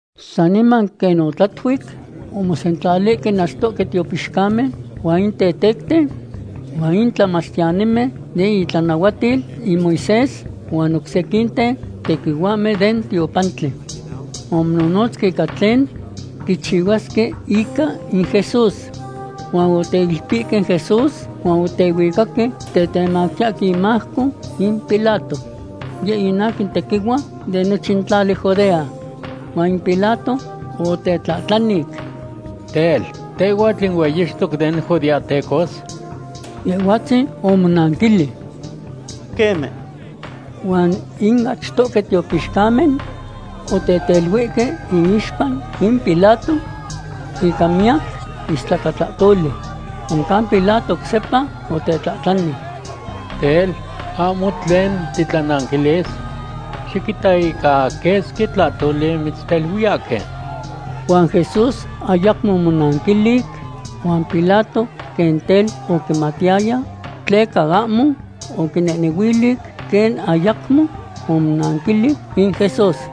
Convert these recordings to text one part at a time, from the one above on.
Saniman quen otlatuic omosentlalihque in achtohque tiopixcamen huan in tetecten huan in tlamachtiyanimen den itlanahuatil in Moisés huan oc sequinten tequihuahmen den tiopantli. Omonohnotzque ica tlen quichihuasque ica in Jesús. Huan oteilpihque in Jesús huan otehuicaque tetemactiyahque imajco in Pilato. Yeh in aquin tequihua de nochin tlali Judea. Huan in Pilato otetlahtlanic: ―Tel, ¿tehhuatl in hueyixtoc den judeahtecos? Yehhuatzin omonanquilic: ―Queme. Huan in achtohque tiopixcamen oteteluihque iixpa in Pilato ica miyac istlacatlahtoli. Oncan Pilato oc sepa otetlahtlani: ―Tel, ¿ahmo tlen titlananquilis? Xiquita ica quesqui tlahtoli mitzteluiyahque. Huan Jesús ayacmo omonanquilic, huan Pilato quen tel oquimatiyaya tleca ahmo oquinehnehuilic quen ayacmo omonanquilic in Jesús.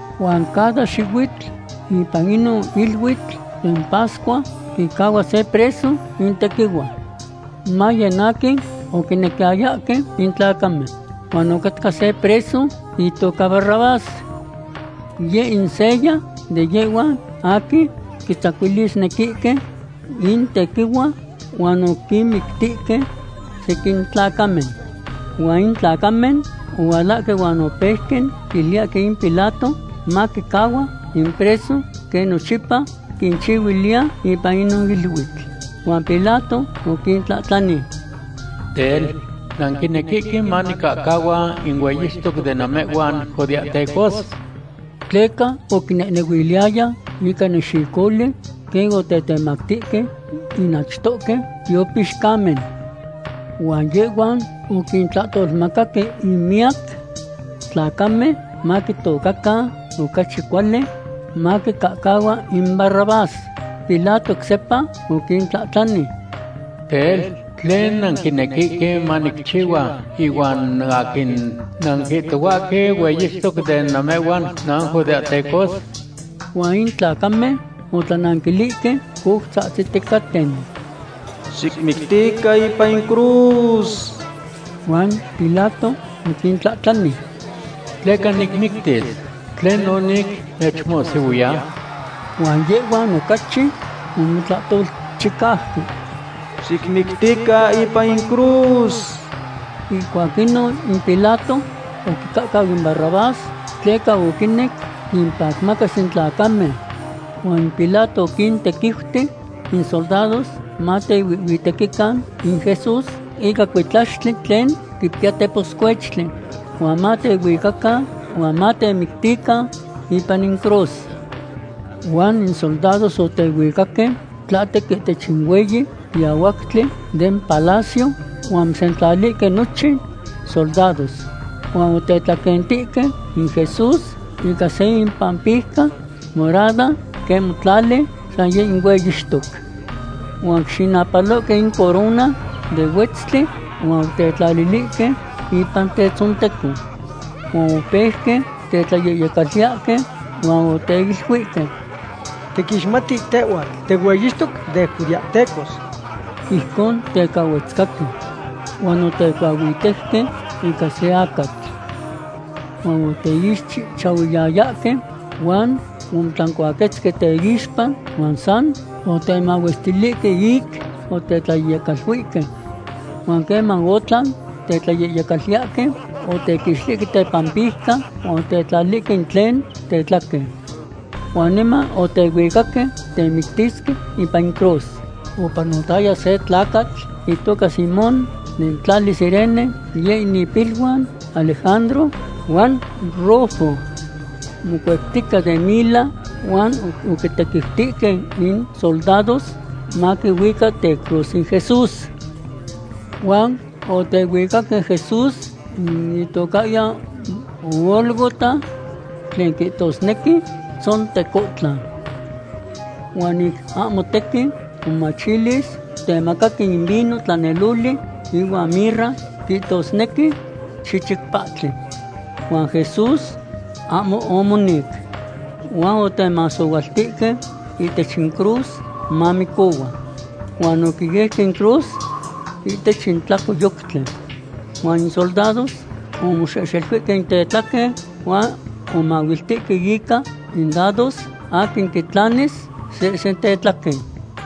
Huan cada xihuitl ipan inon iluitl den pascua quicahcahua se preso in tequihua. Maye in aquin oquinequiyayahque in tlacamen. Huan ocatca se preso itoca Barrabás. Yeh in seya de yehhuan aquin quitzacuilisnequihque in tequihua huan oquinmictihque sequin tlacamen. Huan in tlacamen ohualahque huan opeuque quiluiyahque in Pilato maquicahcahua in preso quen nochipa quinchihuiliya ipan inon iluitl. Huan Pilato oquintlahtlani: ―Tel, ¿nanquinequihque manicahcahua in hueyixtoc de namehhuan judeahtecos? Tleca oquinehnehuiliyaya ica nexicoli quen otetemactihque in achtohque tiopixcamen. Huan yehhuan oquintlahtolmacaque in miyac tlacamen maquihtocan ocachi cuali maquicahcahua in Barrabás. Pilato oc sepa oquintlahtlani: ―Tel, ¿tlen nanquinequihque manicchihua ihuan aquin nanquihtohuahque hueyixtoc den namehhuan nanjudeahtecos? Huan in tlacamen otlananquilihque, coutzahtziticaten: ―¡Xicmictican ipan in cruz! Huan Pilato oquintlahtlani: ―¿Tleca nicmictis? ¿Tlenon ic mechmohsihuiya? Huan yehhuan ocachi omotlahtolchicauque: ―¡Xicmictican ipan in cruz! Ihcuac inon in Pilato oquicahcau in Barrabás tleca oquinec quimpacmacas in tlacamen. Huan in Pilato oquintequiuti in soldados matehuihhuitequican in Jesús ica cuitlaxtli tlen quipiya teposcuechtli, huan matehuicacan huan matemictican ipan in cruz. Huan in soldados otehuicaque tlahtec ihtech in hueyi quiahuactli den palacio huan omosentlalihque nochin soldados. Huan otetlaquentihque in Jesús ica se impampijca morada quen motlali san yeh in hueyixtoc, huan oquixinapalohque in corona de huetztli, huan otetlalilihque ipan tetzonteco. Huan opeuque tetlayehyelcaluiyahque huan oteiluihque: ―¡Tiquixmati tehhuatl tihueyixtoc den judeahtecos! Ijcon teca ohuetzcahque. Huan otecuahuitejque ica se acatl. Huan oteixchihchahuiyayahque huan omotlancuaquetzque teixpa huan san otemahuestilihque ic otetlayehyecaluihque. Huan queman otlan tetlayehyecaluiyahque, otequixtilihque tepampijca huan otetlalilihque in tlen tetlaquen. Huan niman otehuicaque temictisque ipan in cruz. Opanotaya se tlacatl itoca Simón den tlali Cirene, yeh in ipiluan Alejandro huan Rufo. Mocueptica den mila huan oquitequiutihque in soldados maquihuica tecruz in Jesús. Huan otehuicaque Jesús in itocahyan Gólgota, tlen quihtosnequi Tzontecontlan. Huan ic ahmo tequin momachilis, otemacaque in vino tlaneloli ihuan mirra, quihtosnequi chichic pahtli. Huan Jesús ahmo omonic. Huan otemasohualtihque ihtech in cruz mamicohua, huan oquiejque in cruz ihtech in tlacoyoctli. Huan in soldados omoxehxeluihque in tetlaquen huan omahuiltihque ica in dados aquin quitlanis sehsen tetlaquen.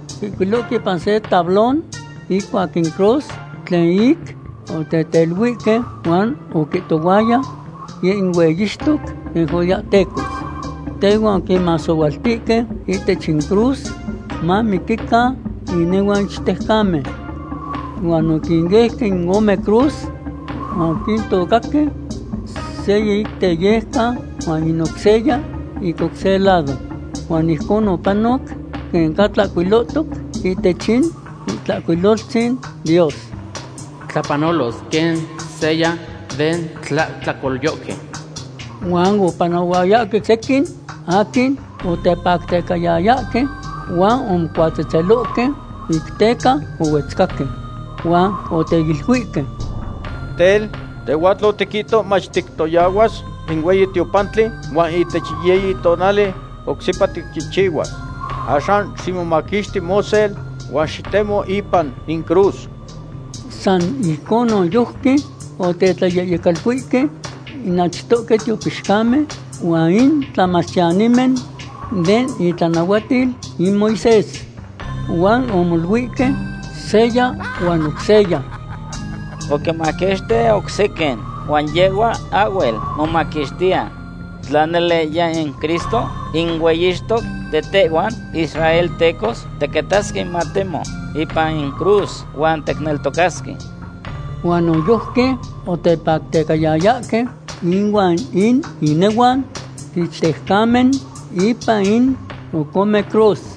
Oquihcuilohque ipan se tablón icuac in cruz tlen ic oteteluihque huan oquihtohuaya: “Yeh in hueyixtoc den judeahtecos.” Tehuan oquinmasohualtihque ihtech incruz mamiquican inehuan ichtejcamen. Huan oquineuque in ome cruz, huan oquintocahque seya ic teyejcan, huan in oc seya ic oc se lado. Huan ijcon opanoc quen ca tlahcuilohtoc ihtech in Itlahcuiloltzin Dios: “Tlapanolos quen seya den tlahtlacolyohque.” Huan opanohuayahque sequin aquin otepactecayayahque huan omocuatzetzelohque ic teca ohuetzcahque. Huan oteiluihque: ―Tel, tehhuatl otiquihto mach tictoyahuas in hueyi tiopantli huan ihtech yiyi tonali oc sepa ticchihchihuas. Axan ximomaquixti mosel huan xitemo ipan in cruz. San ijcon noyojqui otetlayehyecaluihque in achtohque tiopixcamen huan in tlamachtiyanimen den itlanahuatil in Moisés. Huan omoluihque seya huan oc seya: ―Oquinmaquixtic oc sequin huan yehhua ahhuel momaquixtiya. Tla nele yeh in Cristo, in hueyixtoc de tehhuan israeltecos, tiquitasque matemo ipan in cruz huan ticneltocasque. Huan noyojqui otepactecayayahque ihuan in inehuan ichtejcamen ipan in oc ome cruz.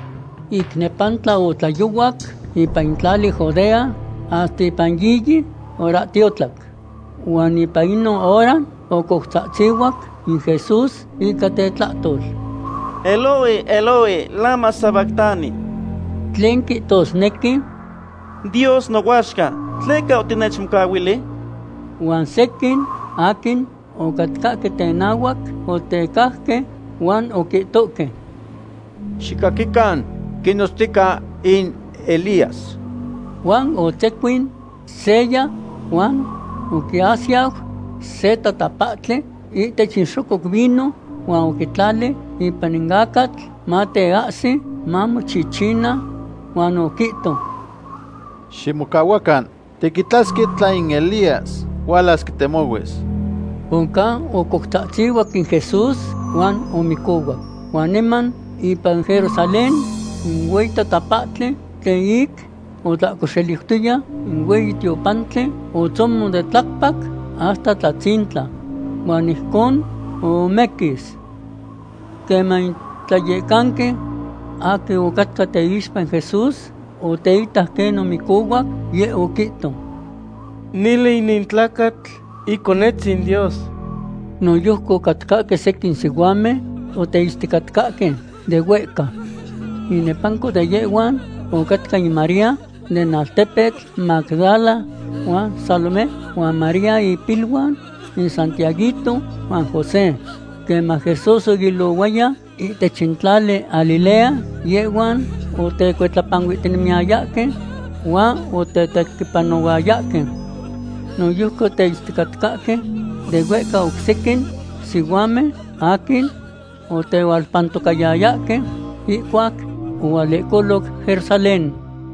Ic nepantla otlayohuac ipan in tlali Judea hasta ipan yiyi horahtiotlac. Huan ipan inon hora ocoutzahtzihuac in Jesús ica tetlahtol: ―Eloi, Eloi, ¿lama sabactani? ―tlen quihtosnequi: Dios nohuaxca, ¿tleca otinechmocahuili? Huan sequin aquin ocatcahque tenahuac otecajque huan oquihtohque: ―Xicaquican, quinotztica in Elías. Huan otzecuin seya huan oquiasiyau se tatapahtli ihtech in xococ vino huan oquitlali ipan in acatl mateahsi mamochichina, huan oquihto: ―Ximocahuacan. Tiquitasque tla in Elías hualas quitemohuis. Oncan ocoutzahtzihuac in Jesús huan omicohuac. Huan niman ipan Jerusalén in hueyi tatapahtli tlen ic otlahcoxeliutoya in hueyi tiopantli otzomon de tlacpac hasta tlatzintla huan ijcon ohomequis. Queman in tlayecanqui aquin ocatca teixpa in Jesús oteitac quen omicohuac, yeh oquihto: ―Nele inin tlacatl Iconetzin Dios. Noyojqui ocatcahque sequin sihuamen oteitzticatcahque de huehca. Inepanco de yehhuan ocatca in María den altepetl Magdala, huan Salomé, huan María ipiluan in Santiaguito huan José. Queman Jesús oilohuaya ihtech in tlali Galilea yehhuan otecuitlapanuihtinemiyayahque huan otetequipanohuayahque. Noyojqui oteitzticatcahque de huehca oc sequin sihuamen aquin otehualpantocayayahque ihcuac ohualehcoloc Jerusalén.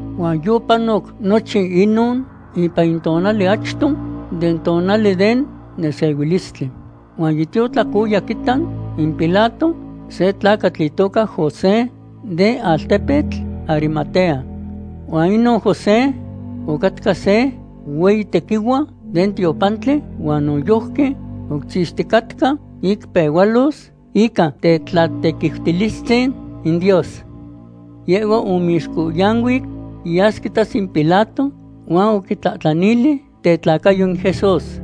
Huan yopanoc nochin inon ipan in tonali achto den tonali den nesehuilistli. Huan yitiotlac oya quiita in Pilato se tlacatl itoca José den altepetl Arimatea. Huan inon José ocatca se hueyi tequihua den tiopantli huan noyojqui oquichixticatca ic pehualos ica tetlatequiutilistzin in Dios. Yehhua omixcohyanuic yas quitas in Pilato huan oquitlahtlanili tetlacayo in Jesús.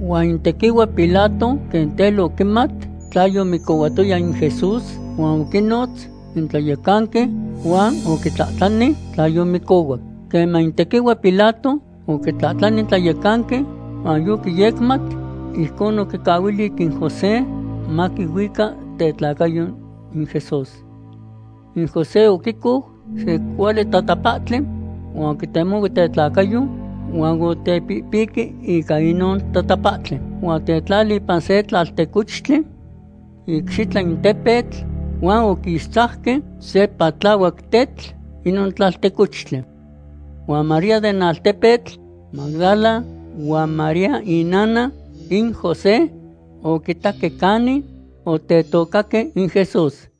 Huan in tequihua Pilato quen tel oquimat tla yomicohuatoya in Jesús, huan oquinotz in tlayecanqui huan oquitlahtlani tla yomicohuac. Queman in tequihua Pilato oquitlahtlani in tlayecanqui huan yoquiyecmat, ijcon oquicahuili in José maquihuica tetlacayo in Jesús. In José oquicou se cuali tatapahtli huan oquitemohui tetlacayo huan otepihpiqui ica inon tatapahtli. Huan otetlali ipan se tlaltecochtli icxitla in tepetl, huan oquixtzajque se patlahuac tetl inon tlaltecochtli. Huan María den altepetl Magdala huan María inana in José oquitaque canin otetocaque in Jesús.